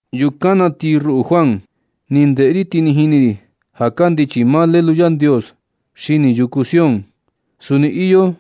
Yukan na ti ruꞌu Juan, ni ndeꞌe ri, ti ni jini ri ja kandichi maa Lelu Yandios xini yuku Sión. Suni iyo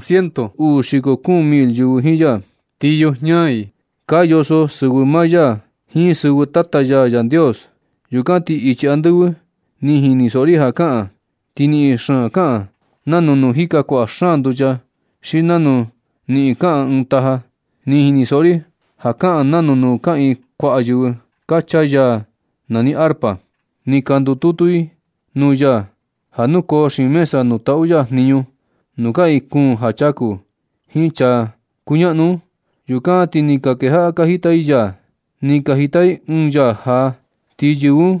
ciento uu xiko kuun mil yɨvɨ jiin ya. Ti yujiña i ka yoso sɨvɨ maa ya jiin sɨvɨ Tata ya Yandios. Yukan ti ichi andɨvɨ ni jinisoꞌo ri ja kaꞌan, ti niꞌin xaan kaꞌan nanu nuu jika kuaꞌa xaan nducha xi nanu niꞌin kaꞌan ɨɨn taja. Ni jinisoꞌo ri ja kaꞌan nanu nuu kaꞌiin kuaꞌa yɨvɨ ka chaa yaa nani arpa. Ni ka ndututu i nuu ya ja nukoo xiin mesa nuu taꞌu ya jniñu, nuu kaꞌiin kuun ja chaku jiin chaa ka kuñaꞌnu un. Yukan ti ni ka kejaꞌa ka jita i yaa. Ni ka jita i ɨɨn yaa jaa. Ti yɨvɨ un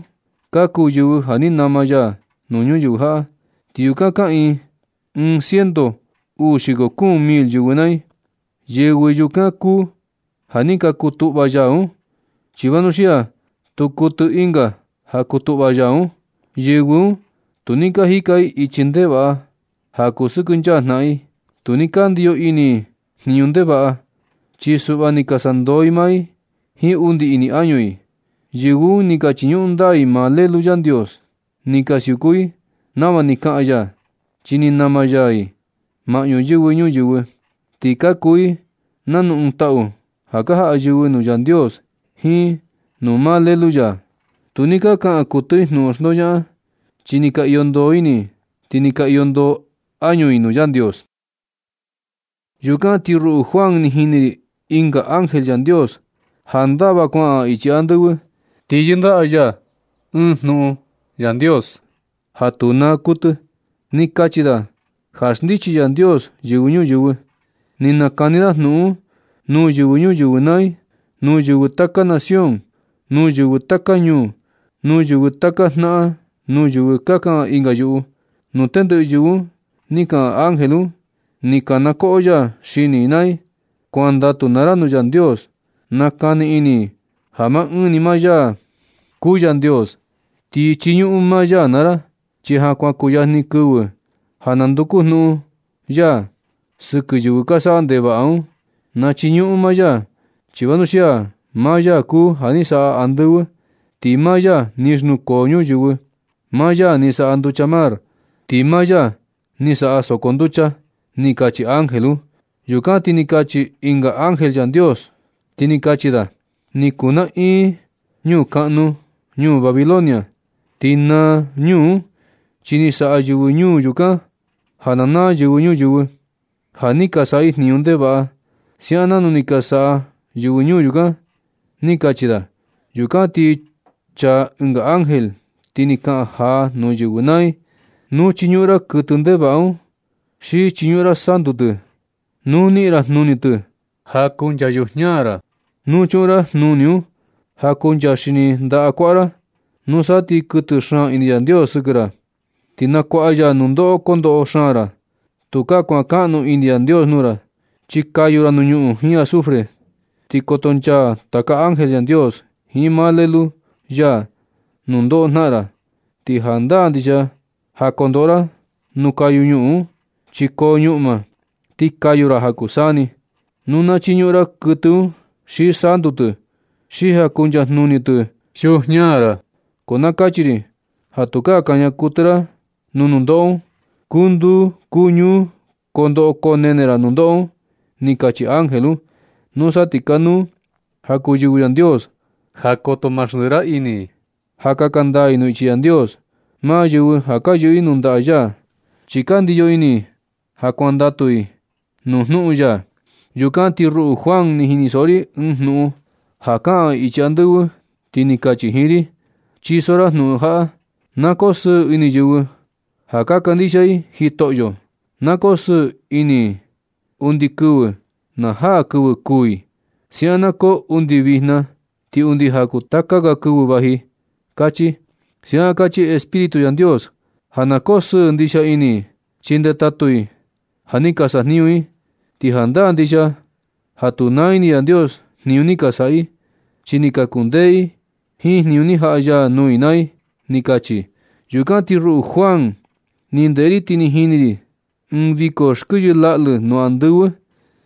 ka kuu yɨvɨ ja ni nama ya nuu ñuyɨvɨ jaꞌa. Ti yukan kaꞌiin ciento uu xiko kuun mil yɨvɨ naa i. Yɨvɨ yukan kuu ja ni ka kutuꞌva yaa un. Chi vanuxia tu kuɨtɨ ɨnga ja kutuꞌva yaa un. Yɨvɨ un tu ni ka jika i ichi ndevaꞌa, ja kusɨkɨnchaa jnaꞌan i. Tu ni ka ndiyo ini i jniñu ndevaꞌa, chi suꞌva ni ka sandoo i maa i jiin undi ini añu i. Yɨvɨ un ni ka chiñuꞌun ndaa i maa Lelu Yandios. Ni ka siuku i nava ni kaꞌan ya. Chi ni nama ya i maꞌñu yɨvɨ ñuyɨvɨ, ti ka kuu i nanu ɨɨn taꞌu ja ka jaꞌa yɨvɨ nuu Yandios jiin nuu maa Lelu ya. Tu ni ka kaꞌan kuɨtɨ i jnuꞌun xndoñaꞌan. Chi ni ka iyo ndoo ini i, ti ni ka iyo ndoo añu i nuu Yandios. Yukan ti ruꞌu Juan, ni jini ri ɨnga ángel Yandios ja ndava kuaꞌan ichi andɨvɨ. Ti yɨndaꞌa ya ɨɨn jnuꞌun Yandios ja tu naa kuɨtɨ. Ni kachi da ja xndichi Yandios yɨvɨ ñuyɨvɨ. Ni nakani da jnuꞌun un nuu yɨvɨ ñuyɨvɨ naa i, nuu yɨvɨ taka nación, nuu yɨvɨ taka ñuu, nuu yɨvɨ taka jnaꞌan, nuu yɨvɨ ka kaꞌan ɨnga yuꞌu, nuu tendɨꞌɨ yɨvɨ un ni kaꞌan ángel un. Ni kanakoꞌo ya xini i naa i: ―Kuandatu naa ra nuu Yandios. Na kani ini ja maa ɨɨn ni maa ya kuu Yandios. Ti chiñuꞌun maa ya naa ra, chi ja kuan kuyajni kɨvɨ ja na nduku jnuꞌun ya sɨkɨ yɨvɨ ka saꞌa ndevaꞌa un. Na chiñuꞌun maa ya, chi vanuxia maa ya kuu ja ni saꞌa andɨvɨ. Ti maa ya ni xnukoo ñuyɨvɨ. Maa ya ni saꞌa nducha mar, ti maa ya ni saꞌa soko nducha ―ni kachi ángel un. Yukan na ti ni chaa ɨnga ángel Yandios, ti ni kachi da: ―Ni kuu naꞌin ñuu kaꞌnu, ñuu Babilonia. Ni naa ñuu un chi ni saꞌa yɨvɨ ñuu yukan ja na naa yɨvɨ ñuyɨvɨ, ja ni ka saꞌa i jniñu ndevaꞌa siaꞌan nanu ni ka saꞌa yɨvɨ ñuu yukan ―ni kachi da. Yukan ti ni chaa ɨnga ángel ti ni kaꞌan jaa nuu yɨvɨ naa i: ―Nu chiñuꞌun ra kuɨtɨ ndevaꞌa un, xi chiñuꞌun ra santu tɨ, nu niꞌin ra jnuni tɨ ja kuncha yujiña ra, nuu chuꞌun ra jnuni un ja kuncha xini ndaꞌa kuaꞌa ra. Nusa ti kuɨtɨ xaan ini Yandios sɨkɨ ra. Ti na kuaꞌa ya nundoꞌo kondoꞌo xaan ra. Tukaa kuankaꞌnu ini Yandios nuu ra, chi kayu ra nuu ñuꞌun jiin azufre, ti koto nchaa taka ángel Yandios jiin maa Lelu ya nundoꞌo jnaꞌan ra. Ti jandaa ndixia ja kondoꞌo ra nuu kayu ñuꞌun un chi koo ñuꞌma, ti kayu ra ja kuu saa ni, nu na chiñuꞌun ra kuɨtɨ un xi santu tɨ xi ja kuncha jnuni tɨ yujiña ra. Ko na kachi ri ja tukaa kaña kuɨtɨ ra nuu nundoꞌo un. Kuu nduu kuu ñuu koo ndoꞌo koo nene ra nundoꞌo un ―ni kachi ángel un. Nusa ti kanuu ja kuu yɨvɨ Yandios ja koto ma xndiꞌi ra ini i ja kaka ndaa i nuu ichi Yandios, maa yɨvɨ ja ka yɨꞌɨ nuu ndaꞌa ya, chi ka ndiyo ini i ja kuandatu i nuu jnuꞌun ya. Yukan ti ruꞌu Juan, ni jinisoꞌo ri ɨɨn jnuꞌun ja kaꞌan ichi andɨvɨ ti ni kachi jiin ri: ―Chiso ra jnuꞌun jaꞌa: “Na koo sɨɨ ini yɨvɨ ja ka kandixia i Jitoꞌyo. Na koo sɨɨ ini i undi kɨvɨ na jaa kɨvɨ kuū i. Siaꞌan na koo undi vijna ti undi ja kuu taka ga kɨvɨ vaji”, kachi. Siaꞌan kachi Espíritu Yandios ja na koo sɨɨ ndixia ini i, chi ndetatu i ja ni ka sajniñu i. Ti jandaa ndixia ja tu naa ini Yandios jniñu ni ka saꞌa i, chi ni ka kundee i jiin jniñu ni jaꞌa ya nuu i naa i ―ni kachi. Yukan ti ruꞌu Juan, ni ndeꞌe ri ti ni jini ri ɨɨn viko xkɨyɨ laꞌlɨ nuu andɨvɨ.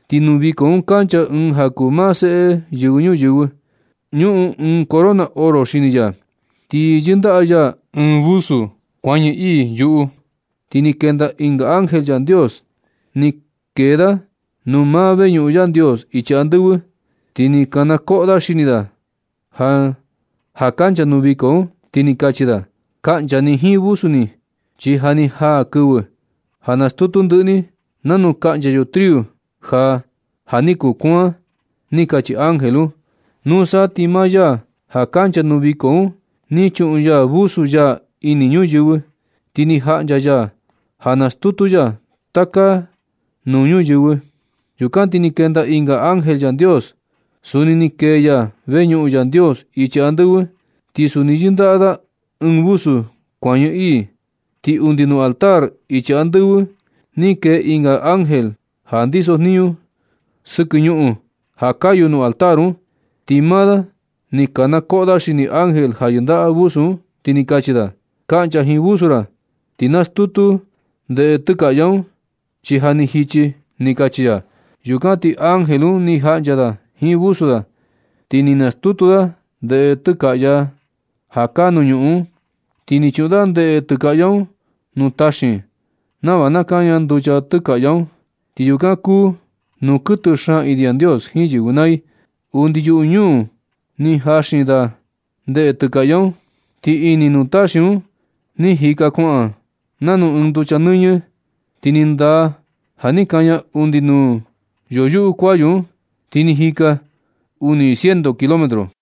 Ti nuu viko un kancha ɨɨn ja kuu maa Seꞌe Yɨvɨ Ñuyɨvɨ. Ñuꞌun ɨɨn corona oro xini ya. Ti yɨndaꞌa ya ɨɨn vusu kuañɨ ii yuꞌu. Ti ni kenda ɨnga ángel Yandios. Ni kee da nuu maa veñuꞌun Yandios ichi andɨvɨ, ti ni kanakoꞌo da xini da ja kancha nuu viko un, ti ni kachi da: ―Kaꞌncha ni jiin vusu ni, chi ja ni jaa kɨvɨ ja nastutu ndɨꞌɨ ni, nanu kaꞌncha yo triu ja ja ni kuaan ―ni kachi ángel un. Nusa ti maa ya ja kancha nuu viko un ni chuꞌun ya vusu ya ini ñuyɨvɨ, ti ni jaꞌncha ya ja nastutu ya taka nuu ñuyɨvɨ. Yukan ti ni kenda ɨnga ángel Yandios. Suni ni kee ya veñuꞌun Yandios ichi andɨvɨ ti suni yɨndaꞌa da ɨɨn vusu kuañɨ ii. Ti undi nuu altar ichi andɨvɨ ni kee ɨnga ángel ja ndisojniñu sɨkɨ ñuꞌun ja kayu nuu altar un. Ti maa da un ni kanakoꞌo da xini ángel ja yɨndaꞌa vusu un, ti ni kachi da: ―Kaꞌncha jiin vusu ra, ti nastutu ra ndeꞌe tɨkaꞌya un, chi ja ni jichi ―ni kachi ya. Yukan ti ángel un ni jaꞌncha da jiin vusu da, ti ni nastutu da ndeꞌe tɨkaꞌya ja kaa nuu ñuꞌun un. Ti ni chuꞌun da ndeꞌe tɨkaꞌya un nuu taxin nava na kaña nducha tɨkaꞌya un, chi yukan kuu nuu kuɨtɨ xaan ini Yandios jiin yɨvɨ naa i. Undi yuꞌu ñuu un ni jaxin da ndeꞌe tɨkaꞌya un. Ti ini nuu taxin un ni jika kuaꞌan nanu ɨɨn yucha nɨñɨ. Ti ni ndaa ja ni kaña undi nuu yoyuꞌu kuayu un, ti ni jika undi uni ciento kilómetro.